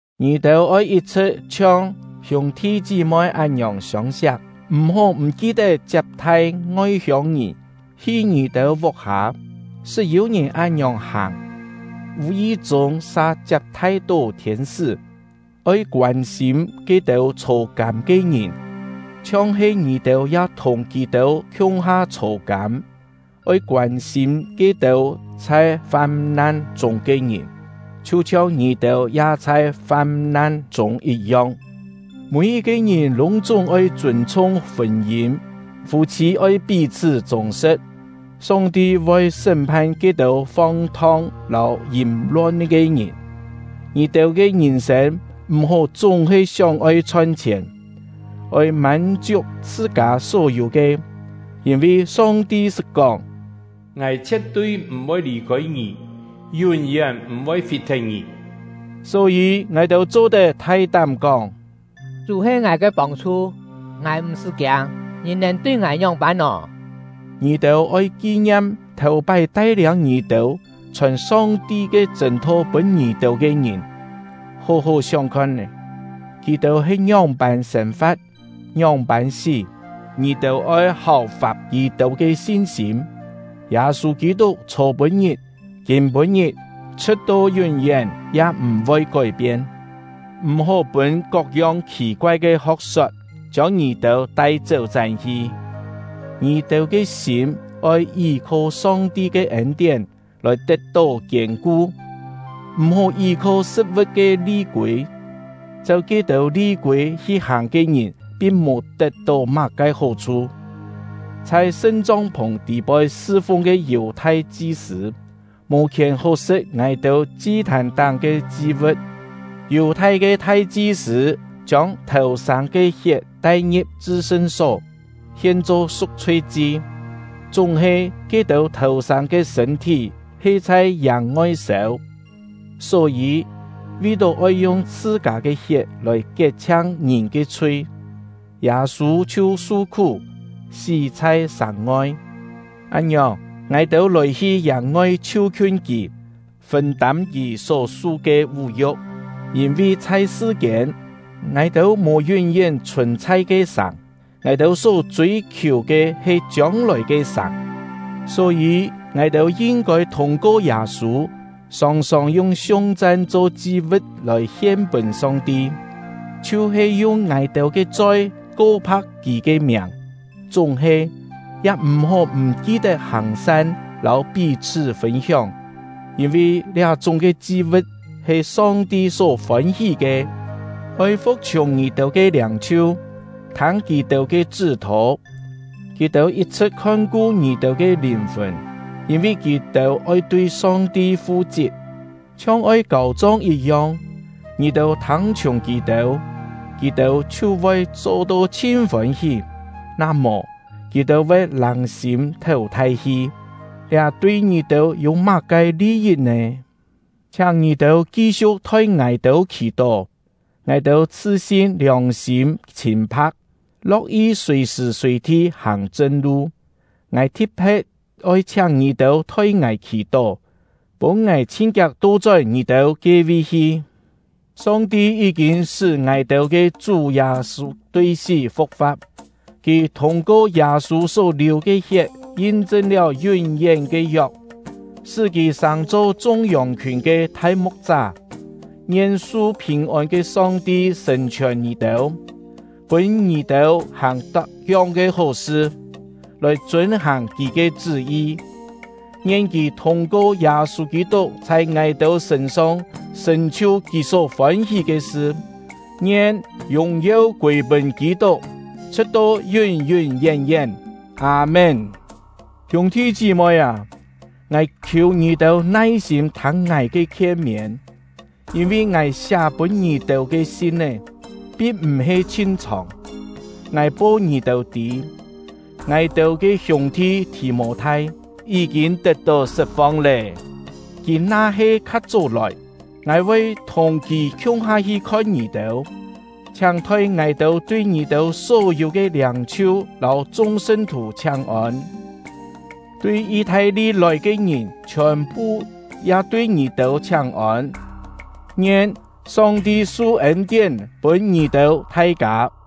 Ngì-têu oi yit-chhṳ̍t chhiong hiûng-thi chí-moi án-ngiòng siông-siak. M̀-hó m̀ ki-tet chiap-thai ngoi-hiông-ngìn hi ngì-têu vuk-hâ. Sṳt yû-ngìn án-ngiòng hàng, vù-yi-chûng sa chiap-thai-tó thiên-sṳ́. Oi koân-sîm ke-têu chhô-kâm ke ngìn, chhiong-he ngì-têu ya thùng kì-têu khiung-ha chhô-kâm. Oi koân-sîm ke-têu chhai fam-nan chûng ke ngìn, chhiu-chhiong ngì-têu ya chhai fam-nan chûng yit-yong. Mî-yit-ke ngìn lûng-chúng oi chûn-chhung fûn-yîn; fû-chhî oi pí-chhṳ́ chûng-sṳ̍t. Song-ti voi sṳ́m-phan ke-têu fong-thong lâu yìm-lon ke ngìn. Ngì-têu ke ngìn-sên m̀-hó chúng-he sióng-oi chhon-chhièn; oi mân-chiuk chhṳ-kâ só yû ke. Yîn-vi Song-ti sṳt kóng: “Ngài chhie̍t-tui m̀-voi lì-khôi ngì, yún-yén m̀-voi fit-thet ngì.” Só-yî, ngài-têu cho-tet thai-tám kóng: Chú he ngài ke pông-chhu, ngài m̀-sṳ́ kiâng; ngìn nèn tui ngài ngióng-pân nò? Ngì-têu oi ki-ngiam thèu-pái tai-liâng ngì-têu, chhòn Song-ti ke chṳ̂n-tho pûn ngì-têu ke ngìn. Hó-hó sióng khon-é, kì-têu he ngióng-pân sên-fa̍t, ngióng-pân sí; ngì-têu oi háu-fap kì-têu ke sin-sîm. Yâ-sû Kî-tuk chhô-pû-ngit, kîm-pû-ngit, chhṳ̍t-to yún-yén, ya m̀-voi kói-pien. M̀-hó pûn kok-yong khì-koai ke ho̍k-sot chiông ngì-têu tai chéu-chán-hi. Ngì-têu ke sîm oi yí-kho Song-ti ke ên-tién lòi tet-tó kiên-ku, m̀-hó yí-kho sṳ̍t-vu̍t ke li-kûi; cheu ke-têu li-kûi hi-hàng ke ngìn pin mò tet-tó má-ke hó-chhu. Chhai sṳn-chong-phùng tî-poi sṳ-fung ke Yù-thai chi-sṳ̂, mò khièn hó sṳ̍t ngài-têu chi-thàn-táng ke chi-vu̍t. Yù-thai ke thai-chi-sṳ̂ chiông thèu-sâng ke hiet tai-ngi̍p chṳ-sṳn-só, hien-cho su̍k-chhui-chi; chúng-he ke-têu thèu-sâng ke sṳ̂n-thí he chhai yàng-ngoi sêu. Só-yî, vi-tó oi yung chhṳ-kâ ke hiet lòi kiet-chhiang ngìn ke chhui, Yâ-sû chhiu su-khú, sí chhai sàng-ngoi. Án-ngiòng, ngài-têu lòi-hi yàng-ngoi chhiu-khiun kì, fûn-tâm kì só-su ke vú-yu̍k. Yîn-vi chhai sṳ-kiên, ngài-têu mò yún-yén chhùn-chhai ke sàng; ngài-têu só chûi-khiù ke he chiông-lòi ke sàng. Só-yî, ngài-têu yin-kôi thûng-ko Yâ-sû, sòng-sòng yung siung-chan cho chi-vu̍t lòi hien pûn Song-ti, chhiu-he yung ngài-têu ke choi ko-pha̍k Kì ke miàng. Chúng-he, ya m̀-hó m̀ ki-tet hàng-san lâu pí-chhṳ́ fûn-hióng, yîn-vi liá-chúng ke chi-vu̍t he Song-ti só fôn-hí ke. Oi fu̍k-chhiùng ngì-têu ke liâng-chhiu, thâng kì-têu ke chṳ́-thô. Kì-têu yit-chhṳ̍t khon-ku ngì-têu ke lìn-fùn, yîn-vi kì-têu oi tui Song-ti fu-chit, chhiong oi kâu-chong yit-yong. Ngì-têu thâng-chhiùng kì-têu, kì-têu chhiu voi cho-to chhin fôn-hí; na mò, kì-têu voi lâng-sîm théu thai-hi, liá tui ngì-têu yû má-ke li-yit nè? Chhiáng ngì-têu ki-siu̍k thoi ngài-têu khì-tó. Ngài-têu chhṳ-sin liòng-sîm chhîn-pha̍k, lo̍k-yi sùi-sṳ̀ sùi-thi hàng chṳn-lu. Ngài thi̍t-phe̍t oi chhiáng ngì-têu thoi ngài khì-tó, pûn ngài chhin-kiak to-chón ngì-têu ke-vi hi. Song-ti yí-kîn sṳ́ ngài-têu ke Chú Yâ-sû tui sí fu̍k-fa̍t. Kì thûng-ko Yâ-sû só liù ke hiet yin-chṳn liáu yún-yén ke yok, sṳ́ kì sàng-cho chung yòng-khiùn ke Thai-mu̍k-chá. Ngien su phìn-ôn ke Song-ti sṳ̀n-chhiòn ngì-têu, pûn ngì-têu hàng tak-yong ke hó-sṳ, lòi chûn-hàng Kì ke chṳ́-yi! Ngien Kì thûng-ko Yâ-sû Kî-tuk chhai ngài-têu sṳ̂n-song sṳ̀n-chhiu Kì só fôn-hí ke sṳ! Ngien yùng-yeu kûi-pûn Kî-tuk, chhṳ̍t-to yún-yún yén-yén! Â-mén. Hiûng-thi chí-moi â, ngài khiù ngì-têu nai-sîm thâng ngài ke khien-miên; yîn-vi ngài siá pûn ngì-têu ke sin-é, pin m̀-he chhin chhòng. Ngài po ngì-têu tî, ngài-têu ke hiûng-thi Thì-mô-thai yí-kîn tet-tó sṳt-fong lé. Kì na-he kha chó lòi, ngài voi thùng kì khiung-ha hi khon ngì-têu. Chhiáng thoi ngài-têu tui ngì-têu só-yû ke liâng-chhiu lâu chung sṳn-thù chhiáng-ôn. Tui Yi-thai-li lòi ke ngìn chhiòn-phu ya tui ngì-têu chhiáng-ôn. Ngien Song-ti su ên-tién pûn ngì-têu thai-kâ!